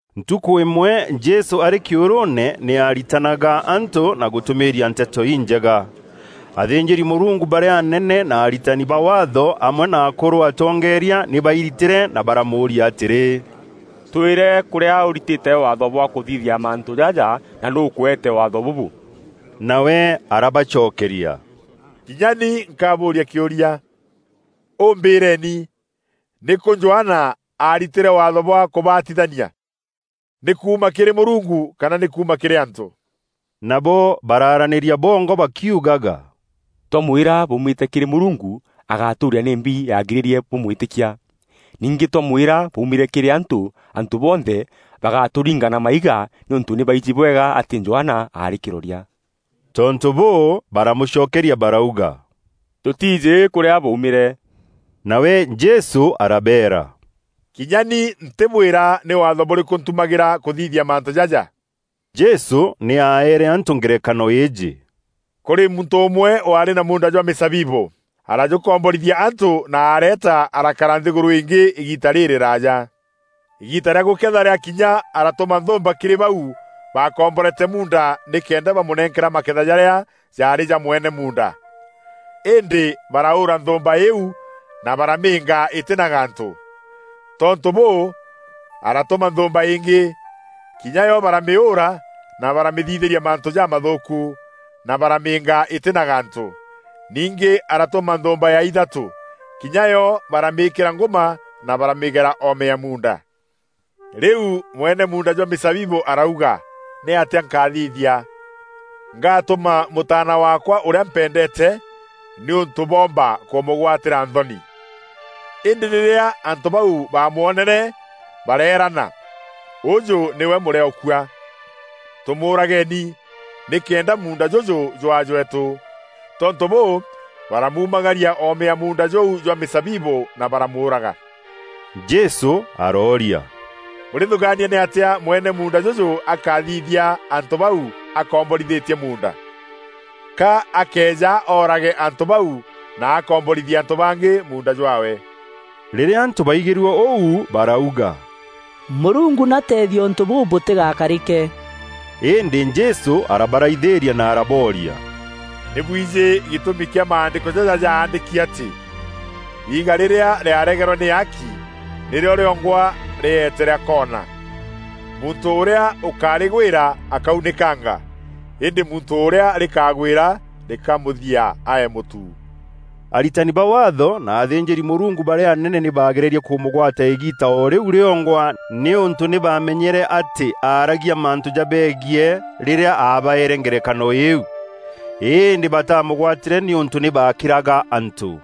Ntukû îmwe Jesû arî kîûrûûne nî aaritanaga antû na gûtûmîîria Nteto Injega. Athînjîri-Mûrungu barîa anene na aritani ba Waatho amwe na akûrû atongeeria nî bairitîre na baramûûria atîrî, “Twîre kûrîa ûritîte waatho bwa kûthithia mantû jaja na nûû ûkûeete Waatho bûbû?” Nawe arabacokeria, “Kinya ni nkabûûria kîûria. Û mbîreeni, nîkû Johana aaritîre waatho bwa kûbatithania? Nî kuuma kîrî Mûrungu kana nî kuuma kîrî antû?” Nabo baraaranîria bongwa bakiugaga, “Twamwîra ‘bwaumîte kîrî Mûrungu’ agatûûria, ‘Nîmbi yaagirîrie bûmwîtîkia?’ Ningî twamwîra, ‘Bwaumîre kîrî antû,’ antû bonthe bagatûringa na maiga, nîûntû nî baijî bwega atî Johana aarî kîroria.” Tontû bûû, baramûcokeria barauga, “Tûtiijî kûrîa bwaumîre.” Nawe Jesû arabeera, “Kinya ni ntîbwîra nî Waatho bûrîkû ntumagîra kûthithia mantû jaja.” Jesû nî aeere antû ngerekano îîjî: “Kûrî muntû ûmwe waarî na muunda jwa mîzabibû. Arajûkomborithia antû na areeta arakara nthîgûrû îngî îgiita rîrîraaja. Îgiita rîa gûketha rîakinya aratûma nthûûmba kîrî bau baakomborete muunda nîkenda bamûnenkera maketha jarîa jaarî ja mwene muunda. Îndî baraûûra nthûûmba îîu na baramîînga îtî na gantû. Tontû bûû, aratûma nthûûmba îngî. Kinya yo baramîûûra, na baramîthithîria mantû jamathûûku, na baramîînga îtî na gantû. Ningî aratûma nthûûmba ya ithatû. Kinya yo baramîîkîra ngûma na baramîgera oome ya muunda. Rîu mwene muunda jwa mîzabibû arauga, ‘Nîatîa nkathithia? Ngaatûma mûtaana waakwa ûrîa mpendeete nîûntû bûomba kûmûgwatîra nthoni.’ Îndî rîrîa antû bau baamwonere bareerana, ‘Ûjû nîwe mûrîaûkua. Tûmûûrageeni, nîkenda muunda jûjû jwaa jweetû.’ Tontû bûû, baramuumagaria oome ya muunda jûu jwa mîzabibû na baramûûraga.” Jesû arooria, “Bûrîthûgaania nîatîa mwene muunda jûjû akathithia antû bau akomborithîtie muunda? Ka akeeja oorage antû bau na akomborithie antû bangî muunda jwaawe.” Rîrîa antû baigîrue ûu barauga, “Mûrungu nî ateethie ûntû bûu bûtîgakarîke.” Îndî Jesû arabaraithîîria na arabooria, “Nî bwijî gîtûmi kîa maandîko jaja jaandîki atî: ‘Iiga rîrîa rîaregerwe nî aaki, nîrîo rîongwa rîeete rîa koona!’ “Muntû ûrîa ûkarîgwîra akaunîkanga, îndî muntû ûrîa rîkagwîra rîkamûthia aee mûtu.” Aritani ba Waatho na athînjîri-Mûrungu barîa anene nî baagererie kûmûgwata îgiita o rîu rîongwa nîûntû nî baamenyere atî aaragia mantû jabeegiî rîrîa aabaeere ngerekano îîu. Îndî batamûgwatîre nîûntû nî baakîraga antû.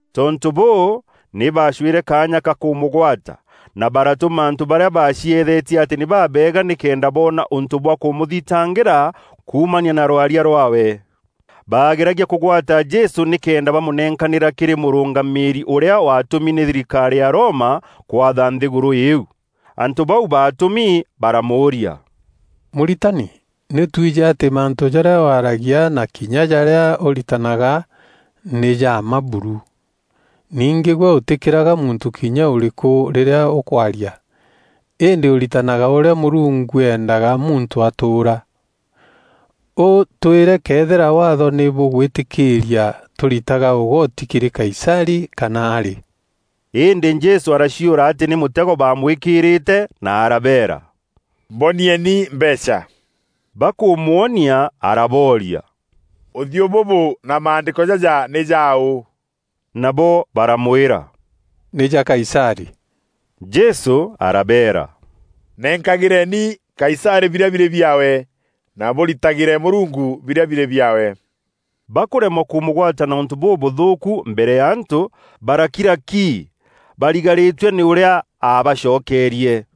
Tontû bûû, nî baacwîre kaanya ka kûmûgwata na baratûma antû barîa baacieethetie atî nî babeega nîkenda boona ûntû bwa kûmûthitangîra kuumania na rwaria rwaawe. Bageragia kûgwata Jesû nîkenda bamûnenkanîra kîrî mûrûngamîîri ûrîa waatûmi nî thirikarî ya Roma kwatha nthîgûrû îîu. Antû bau baatûmi baramûûria, “Mûritani, nî twijî atî mantû jarîa waragia na kinya jarîa ûritanaga nî ja mma buru. Ningî gwe ûtîkîraga muntû kinya ûrîkû rîrîa ûkwaria, îndî ûritanaga ûrîa Mûrungu endega muntû atûûra. Û twîre këethîra Waatho nî bûgwîtîkîîria tûritaga ûgoti kîrî Kaisarî kana arî?” Îndî Jesû araciûra atî nî mûtego baamwîkîîrîte na arabeera, “Mbonieni mbeecha. Bakûmwonia arabooria, Ûthiû bûbû na maandîko jaja nî jaaû?” Nabo baramwîra, “Nî ja Kaisarî.” Jesû arabeera, “Nenkagîreeni Kaisarî birîa birî biaawe, na bûritagîre Mûrungu birîa birî biaawe.” Bakûremwa kûmûgwata na ûntû bûbûthûûku mbere ya antû, baarakira ki, barigarîtue nî ûrîa aabacokerie.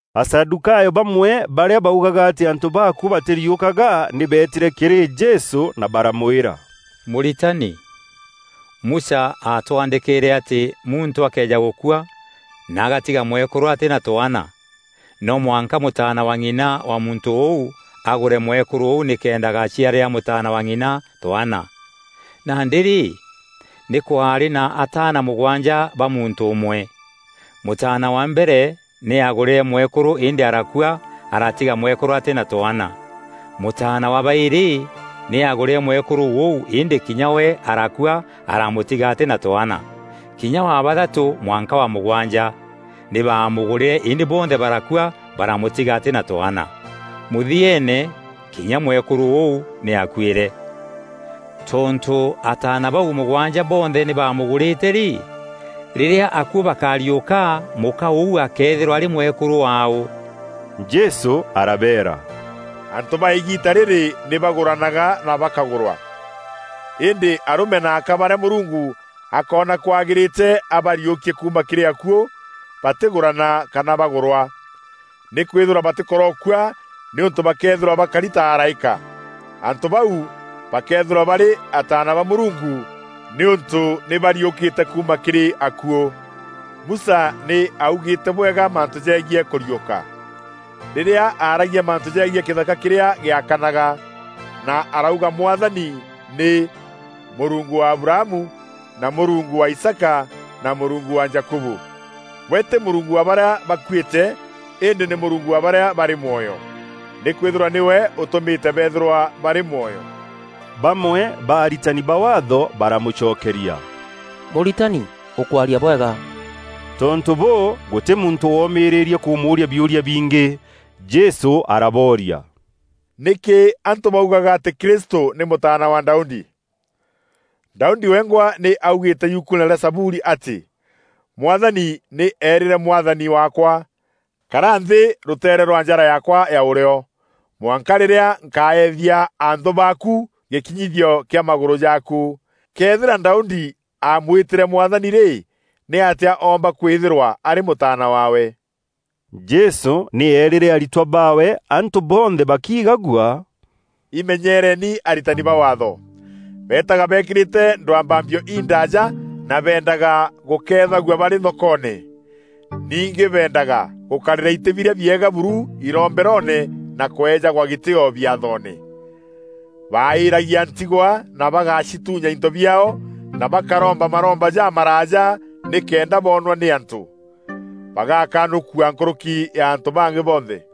Asadûkayo bamwe barîa baugaga atî antû baakuû batîriûkaga nî beetîre kîrî Jesû na baramwîra, “Mûritani, Musa aatwandîkîîre atî muntû akëeja gûkua na agatiga mwekûrû atî na twaana, no mwanka mûtaana wa ng'ina wa muntû ûu, agûre mwekûrû ûu nîkenda agaciarîra mûtaana wa ng'ina twaana. Nandî rî, nî kwaarî na ataana mûgwanja ba muntû ûmwe. Mûtaana wa mbere nî aagûrîre mwekûrû îndî arakua aratiga mwekûrû atî na twaana. Mûtaana wa baîrî nî aagûrîre mwekûrû ûu îndî kinya we arakua aramûtiga atî na twaana. Kinya wa bathatû mwanka wa mûgwanja nî baamûgûrîre îndî bonthe barakua baramûtiga atî na twaana. Mûthieene kinya mwekûrû ûu nî aakuîre. Tontû ataana bau mûgwanja bonthe nî baamûgûrîte rî, rîrîa akuû bakariûka, mûka ûu akeethîrwa arî mwekûrû waaû?” Jesû arabeera, “Antû ba îgiita rîrî nî bagûranaga na bakagûrwa, Îndî arûme na aka barîa Mûrungu akoona kwagîrîte abariûkie kuuma kîrî akuû, batîgûrana kana bagûrwa. Nîkwîthîrwa batîkorokua nîûntû bakeethîrwa bakari ta araîka. Antû bau bakeethîrwa barî ataana ba Mûrungu nîûntû nî bariûkîte kuuma kîrî akuû. Musa nî augîîte bwega mantû jegiî kûriûka, rîrîa aragia mantû jegiî kîthaka kîrîa gîakanaga, na arauga Mwathani nî, ‘Mûrungu wa Abrahamu, na Mûrungu wa Isaaka na Mûrungu wa Jakubu.’ We tî Mûrungu wa barîa bakuîte îndî nî Mûrungu wa barîa barî mwoyo. Nîkwîthîrwa nîwe ûtûmîte beethîrwa barî mwoyo.” Bamwe ba Aritani ba Waatho baramûcokeria, “Mûritani, ûkwaria bwega.” Tontû bûû, gûtî muntû woomîrîîrie kûmûûria biûria bingî. Jesû arabooria, “Nîkî antû baugaga atî Kristû nî mûtaana wa Daudi? Daudi wengwa nî augîîte Yukuune rîa Zaburi atî: ‘Mwathani nî eerîre Mwathani waakwa, kara nthî, rûteere rwa njara yaakwa ya ûrîo, mwanka rîrîa nkaethia anthû baaku, gîkinyithio kîa magûrû jaaku.’ “Këethîra Daudi aamwîtîre ‘Mwathani’ rî, nîatîa oomba kwîthîrwa arî mûtaana waawe?” Jesû nî eerîre aritwa baawe, antû bonthe bakiigagua, “Imenyereeni aritani ba Waatho. Beetaga beekîrîte ndwambambio indaaja na beendaga gûkeethagua barî thokoone. Ningî beendaga gûkarîra itî birîa biega buru iromberoone na kweejagwa gîtîîo biathoone. Baaîîragia ntigwa na bagacituunya into biaao na bakaromba maromba jamaraaja nîkenda boonwa nî antû. Bagaakanûkua nkûrûki ya antû bangî bonthe.”